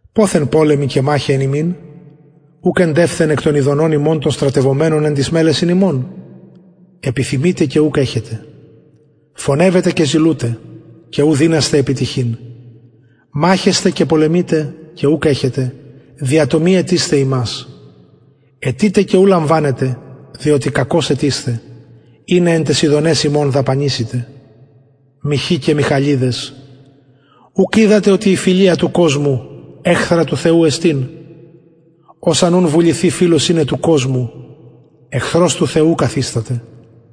ποθεν πολεμοι και μαχαι εν υμιν ουκ εντευθεν εκ των ηδονων υμων των στρατευομενων εν τοις μελεσιν υμων επιθυμειτε και ουκ εχετε φονευετε και ζηλουτε και ου δυνασθε επιτυχειν μαχεσθε και πολεμειτε ουκ εχετε δια το μη αιτεισθαι υμας αιτειτε και ου λαμβανετε διοτι κακως αιτεισθε ινα εν ταις ηδοναις υμων δαπανησητε μοιχοι και μοιχαλιδες ουκ οιδατε οτι η φιλια του κοσμου εχθρα του θεου εστιν ος αν ουν βουληθη φιλος ειναι του κοσμου εχθρος του θεου καθισταται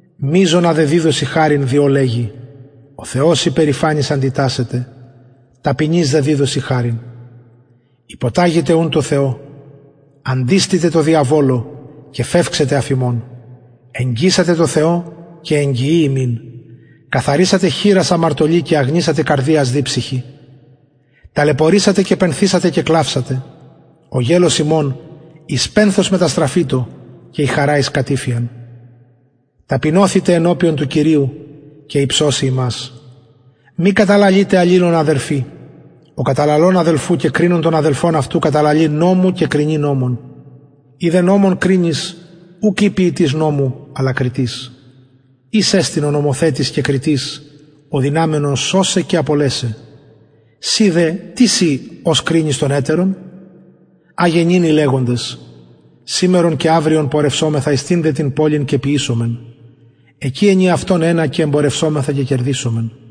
μειζονα δε διδωσιν χαριν διο λεγει ο θεος υπερηφανοις αντιτασσεται ταπεινοις δε διδωσιν χαριν υποταγητε ουν τω θεω αντιστητε δε τω διαβολω και φευξεται αφ υμων εγγισατε τω θεω και εγγιει υμιν καθαρισατε χειρας αμαρτωλοι και αγνισατε καρδιας διψυχοι ταλαιπωρησατε και πενθησατε και κλαυσατε ο γελως υμων εις πενθος μεταστραφητω και η χαρα εις κατηφειαν ταπεινωθητε ενωπιον του κυριου και υψωσει υμας μη καταλαλειτε αλληλων αδελφοι ο καταλαλων αδελφου και κρινων τον αδελφον αυτου καταλαλει νομου και κρινει νομον ει δε νομον κρινεις ουκ ει ποιητης νομου αλλα κριτης εις εστιν ο νομοθετης ο δυναμενος σωσαι και απολεσαι συ δε τις ει ος κρινεις τον ετερον αγε νυν οι λεγοντες σημερον και αυριον πορευσωμεθα εις τηνδε την πολιν και ποιησωμεν εκει ενιαυτον ενα και εμπορευσωμεθα και κερδησωμεν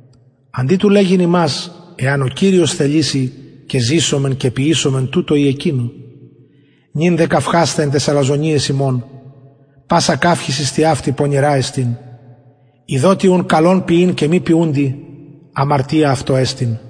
αντι του λεγειν υμας εαν ο κυριος θεληση και ζησωμεν και ποιησωμεν τουτο η εκεινο νυν δε καυχασθε εν ταις αλαζονειαις υμων πασα καυχησις τοιαυτη πονηρα εστιν ειδοτι ουν καλον ποιειν και μη ποιουντι αμαρτια αυτω εστιν